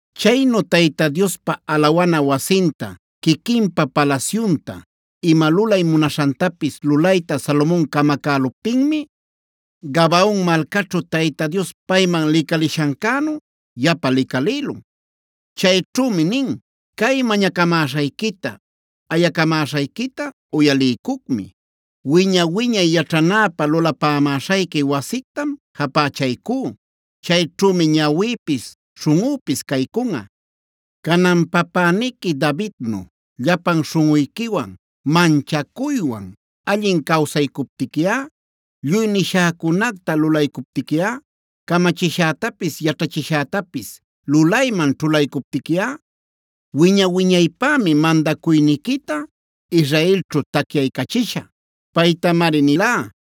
Chaynu Tayta Diospa alawana wasinta, quiquinpa palasyunta, ima lulay munaśhantapis lulayta Salomon camacäluptinmi, Gabaona malcaćhu Tayta Dios payman licalishancänu yapa licalïlun. Chayćhümi nin: “Cay mañacamäśhayquita, ayacamäśhayquita uyaliycucmi. Wiña-wiñay yaćhanäpä lulapamäśhayqui wasictam japächaycú. Chayćhümi ñawïpis śhunꞌüpis caycunꞌa. Canan papäniqui Davidnu llapan śhunꞌuyquiwan, manchacuywan allin cawsaycuptiquiꞌa, lluy nishäcunacta lulaycuptiquiꞌa, camachishätapis, yaćhachishätapis lulayman ćhulaycuptiquiꞌa, wiña-wiñaypämi mandacuyniquita Israelćhu tacyaycachishä. Paytamari nilá: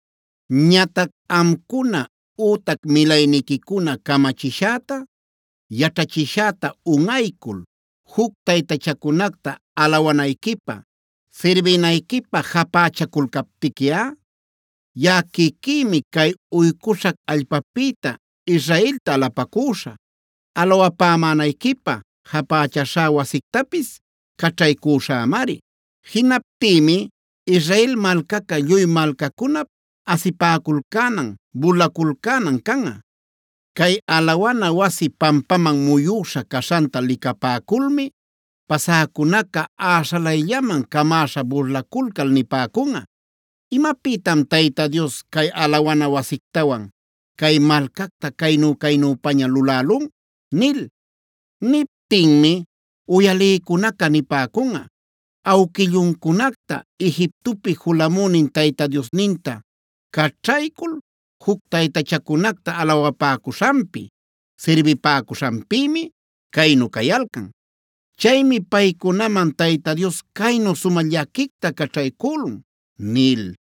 Ñatac amcuna ütac milayniquicuna camachishäta, yaćhachishäta unꞌaycul juc taytachacunacta alawanayquipä, sirbinayquipä japächaculcaptiquiꞌa, yaꞌa quiquïmi cay uycuśhac allpapïta Israelta alapacüśhä. Alawapämänayquipä japächaśhá wasictapis caćhaycüśhämari. Jinaptïmi Israel malcaca lluy malcacunap asipäculcänan, burlaculcänan canꞌa. Cay alawana wasi pampaman muyüśha caśhanta licapäculmi pasäcunaca äśhalayllaman camäśha burlaculcal nipäcunꞌa: ‘¿Imapïtan Tayta Dios, cay alawana wasictawan cay malcacta caynu-caynüpaña lulälun?’ Niptinmi uyalïcunaca nipäcunꞌa: ‘Awquilluncunacta Egiptopi julamünin Tayta Diosninta caćhaycul juc taytachacunacta alawapäcuśhanpi, sirbipäcuśhanpïmi caynu cayalcan. Chaymi paycunaman Tayta Dios caynu sumä llaquicta caćhaycülun’” nil.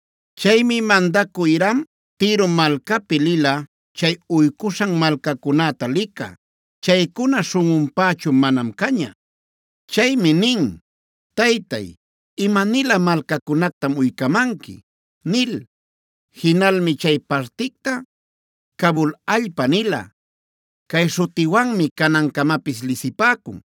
Chaymi mandacü Hiram Tiro malcapi lila chay uycuśhan malcacunäta licä. Chaycuna śhunꞌunpächu manam caña. Chaymi nin: “Taytay, ¿ima-nilä malcacunactam uycamanqui?” nil. Jinalmi chay particta Cabuld allpa nila. Cay śhutiwanmi canancamapis lisipäcun.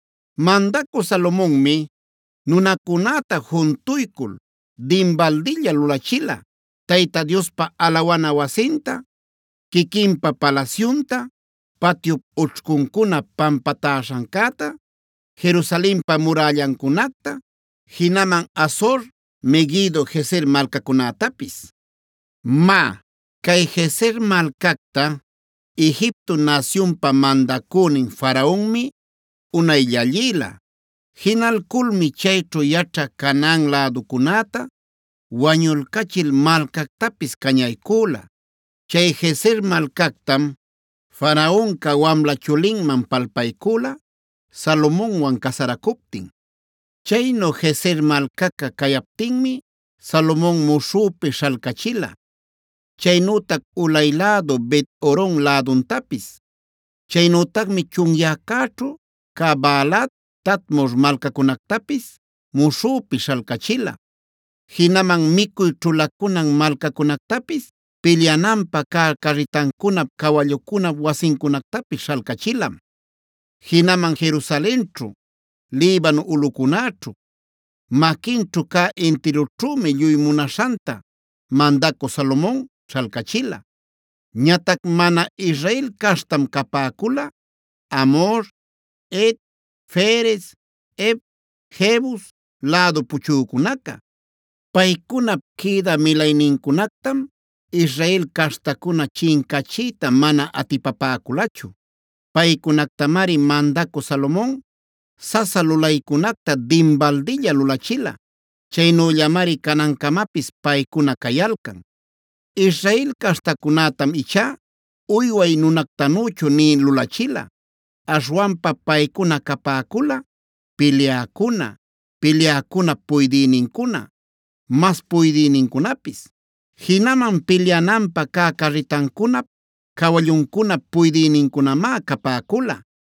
Mandacü Salomonmi nunacunäta juntuycul dinbaldilla lulachila Tayta Diospa alawana wasinta, quiquinpa palasyunta, patyup ućhcuncuna pampatäśhancäta, Jerusalenpa murällancunacta, jinaman Hazor, Meguido, Gezer malcacunätapis. Má, Cay Gezer malcacta Egipto nasyunpa mandacünin Faraonmi unay llallïla. Jinalculmi chayćhu yaćhä Canaan läducunäta wañulcachil malcactapis cañaycüla. Chay Gezer malcactam Faraonca wamla chulinman palpaycüla Salomonwan casaracuptin. Chaynu Gezer malcaca cayaptinmi Salomon muśhüpi śhalcachila, chaynütac ulay lädu Bet-horon läduntapis. Chaynütacmi chunyäcäćhu cä Baalat, Tadmor malcacunactapis muśhüpi śhalcachila. Jinaman micuy ćhulacunan malcacunactapis, pilyananpä cä carritancunap, cawallucunap wasincunactapis śhalcachilam. Jinaman Jerusalenćhu, Libano ulꞌucunäćhu, maquinćhu cä intirućhümi lluy munaśhanta mandacü Salomon śhalcachila. Ñatac mana Israel caśhtam capäcula Amhor, Het, Ferez, Hev, Jebus lädu puchücunaca. Paycunap quïdä milaynincunactam Israel caśhtacuna chincachiyta mana atipapäculachu. Paycunactamari mandacü Salomon sasa lulaycunacta dinbaldilla lulachila. Chaynüllamari canancamapis paycuna cayalcan. Israel caśhtacunätam ichá uyway nunactanüchu nï lulachila. Aśhwanpa paycuna capäcula: pilyäcuna, pilyäcunap puydïnincuna, mas puydïnincunapis. Jinaman pilyananpä cä carritancunap cawalluncunap puydïnincunamá capäcula.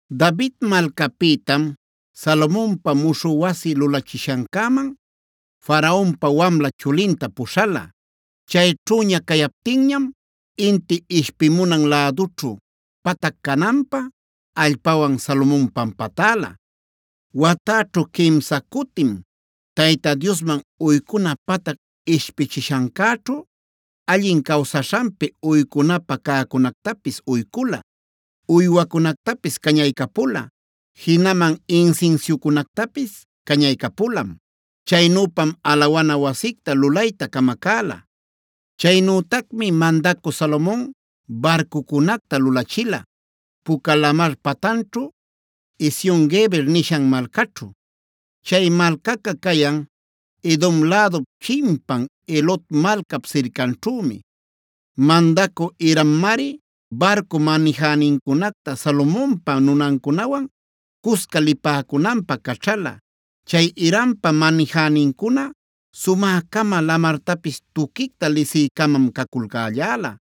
David malcapïtam Salomonpa muśhü wasi lulachishancäman Faraonpa wamla chulinta puśhala. Chayćhüña cayaptinñam inti ishpimunan lädućhu patac cananpä allpawan Salomon pampatäla. Watäćhu quimsae cutim Tayta Diosman uycuna patac ishpichishancäćhu allin cawsaśhanpi uycunapä cäcunactapis uycula, uywacunactapis cañaycapula; jinaman insinsiucunactapis cañaycapulam. Chaynüpam alawana wasicta lulayta camacäla. Chaynütacmi mandacü Salomon barcucunacta lulachila Puca Lamarf patanćhu, Ezion-geber nishan malcaćhu. Chay malcaca cayan Edom lädup chimpan Elot malcap sircanćhümi. Mandacü Hirammari barcu manijänincunacta Salomonpa nunancunawan cusca lipäcunanpä caćhala. Chay Hirampa manijänincuna sumä-cama, lamartapis tuquicta lisï-camam caculcälläla.